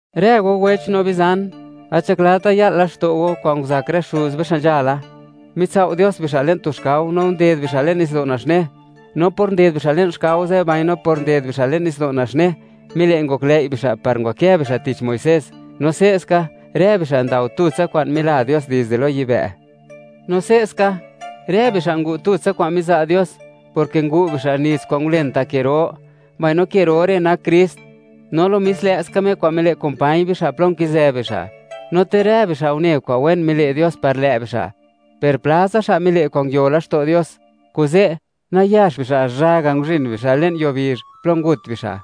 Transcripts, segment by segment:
Rë go wech no bizan, gat nzhaklata ya'l laxto' go kwa'n nguzak rë xuz be xa' nzhala; mitsao' Dios bixa' le'n tu xkao, no nded bixa' le'n nitsdo' Naxne. No por nded bixa' le'n xkao ze', mbaino por nded bixa' le'n nitsdo' Naxne, mile' ngoklëi' bixa' par ngwakë bixa' tich Muisés. No se'ska, rë bixa' ndao tutsa kwa'n mila Dios dizde lo yibë'. No se'ska, rë bixa' ngu' tutsa kwa'n miza' Dios, porke ngu' bixa' nits kwa'n ngulen ta' ke ro, mbaino ke ro re' nak Krist, no lo mis lë'ska Me kwa'n mile' kumpañ bixa' plo nkizë bixa'. No ter rë bixa' une kwa'n wen mile' Dios par lë' bixa', per platsa bixa' mile' kwa'n nangayot laxto' Dios, kuze' nayax bixa' zhaga' nguzhin bixa' le'n yuo bizh, plo ngut bixa'.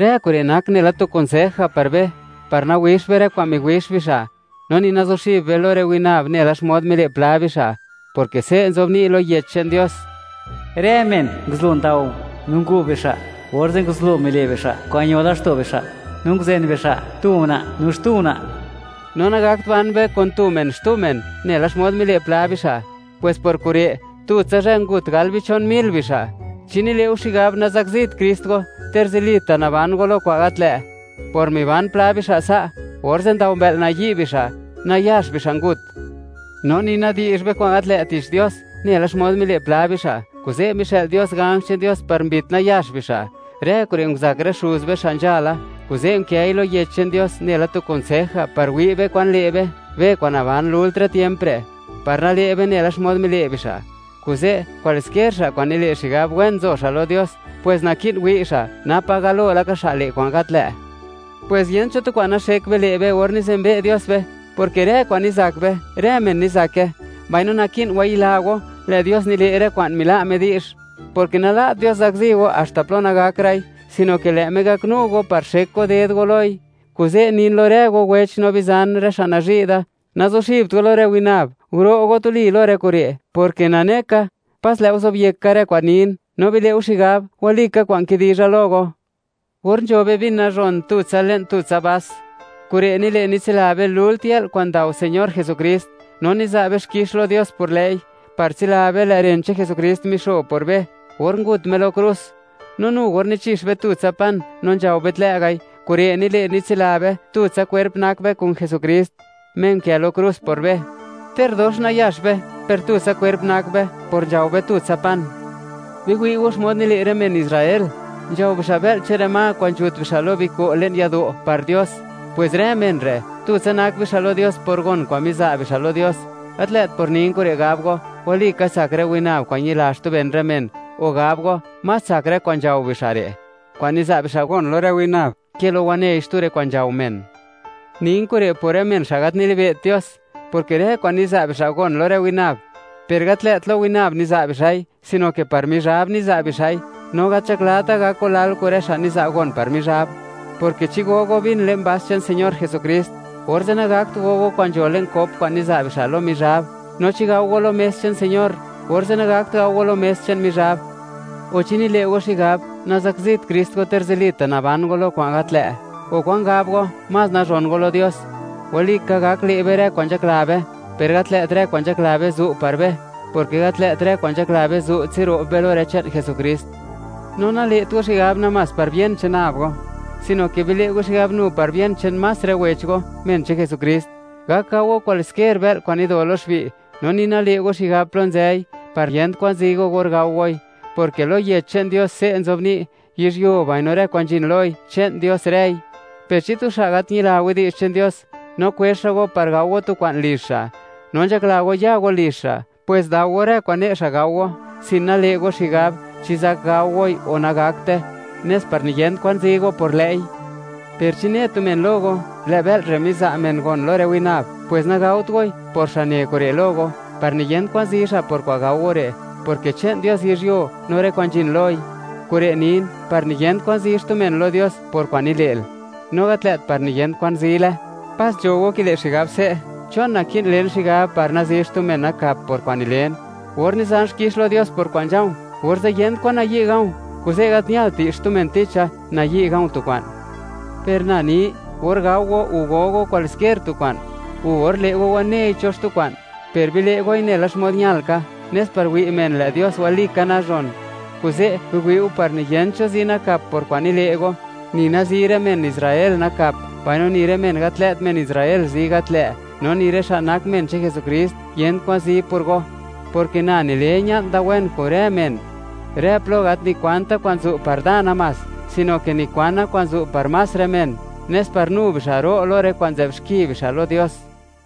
Rë kure' nak nela tu kunsej ga' par be, par nawixt be rë kwa'n miwix bixa'. No ni nazuxib be lo rë winab, nela xmod mile' pla bixa', porke se' nzobni' lo Yech che'n Dios: “Rë men nguzublo ndao, no ngu' bixa', orze' nguzublo mile' bixa' kwa'n ño laxto' bixa', no nguzen bixa' tu una' no xtu una'.” No nagakt ban be kun tu men xtu men, nela xmod mile' pla bixa', pwes por kure' tutsa zhë ngut gal bichon mil bixa'. ¿Chi nile' go xigab, nazakzit Krist go, ter zilita' naban go lo kwa'n gat lë'? Por miban pla bixa' sa', orze' ndao mbë'l nayi' bixa', nayax bixa' ngut. No ni nadi'zh be kwa'n gat lë' tich Dios, nela xmod mile' pla bixa', kuze' mixë'l Dios ganj che'n Dios par mbit nayax bixa'. Rë kure' nguzak rë xuz be, xa' nzhala; kuze' nkëi lo Yech che'n Dios, nela tu kunsej ga' par wi' be kwan le' be, be kwa'n naban lult rë tiemp re', par nale' be nela xmod mile' bixa'. Kuze', kwaliskier xa' kwa'n nile' xigab, wen nzo xa' lo Dios, pwes naki'n wi' xa', napa galo laka xa' le' kwa'n gat lë'. Pwes yent cho tu kwa'n naxek be le' be or nizenbe' Dios be (niwi' Dios xmod nak be), porke rë kwa'n nizak be, rë men nizake. Mbaino naki'n wayila go, lë' Dios nile' rë kwa'n mila' Me di'zh, porke nala't Dios zakzi go haxta plo nagakra'i, sino ke lë' Me gaknu go par xek go ded go loi. Kuze' nin lo rë go wech no bizan, rë xa' nazhi' da, nazuxibt go lo rë winab; guro' go tuli lo rë kure', porke nane ka, pas lë' go zobyek ka kwa'n nin, no bile' go xigab, walika kwa'n kidizha lo go. Or nzho be vin nazhon tutsa le'n tutsa vas, kure' nile' nitsila be lult yë'l kwa'n ndao Señor Jesukrist, no niza' be xkix lo Dios por lë'i, par tsila be, lë' ren che'n Jesukrist mixo por be, or ngut Me lo krus. No nu or nichix be tutsa pan no nzhao be tlë' ga'i, kure' nile', nitsila be, tutsa kwerp nak be kun Jesukrist, Me unkë lo krus por be. Ter dox nayax be, per tutsa kwerp nak be por nzhao be tutsa pan. Biwi' go xmod nile' rë men Israel: Nzhao bixa' bë'l che'n rë ma kwa'n nzhut bixa' lo biko' le'n yado', par Dios. Pwes rë men re', tutsa nak bixa' lo Dios por gon kwa'n miza' bixa' lo Dios. Gat lë't por nin kure' gab go: “Walika tsak rë winab kwa'n ñila xtu ben rë men”, o gab go: “Más tsak rë kwa'n nzhao bixa' re', kwa'n niza' bixa' gon lo rë winab, ke lo wanei xtu rë kwa'n nzhao men.” Nin kure' por rë men xa' gat nilibe't Dios, porke rë kwa'n niza' bixa' gon lo rë winab, per gat lë't lo winab niza' bixa'i, sino ke par Mizhab niza' bixa'i, no gat nzhaklata' gak go lal kun rë xa' niza' gon par Mizhab, porke chi go go vin le'n vas che'n Señor Jesukrist, orze' nagakt go go kwa'n nzho le'n cop kwa'n niza' bixa' lo Mizhab; no chi gao go lo mes che'n Señor, orze' nagakt gao go lo mes che'n Mizhab, o, ¿chi nile' go xigab, nazakzit Krist go, ter zilita' naban go lo kwa'n gat lë'? O, ¿kwan gab go, más nazhon go lo Dios? Walika, gak le' be rë kwa'n nzhakla be, per gat lë't rë kwa'n nzhakla be zu' par be, porke gat lë't rë kwa'n nzhakla be zu' tsiro'b be lo rë che'n Jesukrist. No nale't go xigab namás par bien che'n nab go, sino ke bile' go xigab nu par bien che'n más rë wech go, men che'n Jesukrist. Gak gao go kwaliskier bë'l kwa'n nido lo xbi', no ni nale' go xigab plo nzëi, par yent kwan zi go or gao goi, porke lo Yech che'n Dios, se' nzobni': “Yizhyuo, mbaino rë kwa'n nzhin loi, che'n Dios rëi.” Per chi tu xa' gat ñila widi'zh che'n Dios, no kwezh xa' go par gao go tu kwa'n lizh xa', no nzhakla go ya go lizh xa', pwes dao go rë kwa'n ne' xa' gao go, sin nale' go xigab, chi zak gao goi o nagakte, nes par niyent kwan zi go por lë'i. Per chi ne tu men lo go: “Lë' bë'l re' miza' men gon lo rë winab”, pwes nagaot goi, por xa' ne kure' lo go, par niyent kwan zi xa' por kwa'n gao go re', porke che'n Dios yizhyuo, no rë kwa'n nzhin loi. Kure' nin par niyent kwan zi xtu men lo Dios por kwa'n nile'l, no gat lë't par niyen kwan zile. Pas nzho go kile' xigab se': “¿Chon naki'n len xigab par nazi xtu men nakap por kwa'n nilen? Or nizan xkix lo Dios por kwa'n nzha̱u̱, orze' yent kwan nayi' ga̱u̱, kuze' gat ñalt di'zh xtu men ticha, nayi' ga̱u̱ tu kwa'n.” Per na ni, or gao go o go go kwaliskier tu kwa'n, u or le' go wanei cho xtu kwa'n, per bile' goi nela xmod ñal ka, nes par wi' men, lë' Dios walika nazhon. Kuze', biwi'u par niyent cho zi nakap por kwa'n nile' go, ni nazi rë men Israel nakap, mbaino ni rë men gat lë't men Israel zi gat lë', no ni rë xa' nak men che'n Jesukrist, yent kwan zi por go, porke na nile ña'n da wen kun rë men; rë plo gat nikwanta' kwa'n zu' par da namás, sino ke nikwana kwa'n zu' par más rë men, nes par nu bixa' ro' lo rë kwa'n nzë'b xki bixa' lo Dios.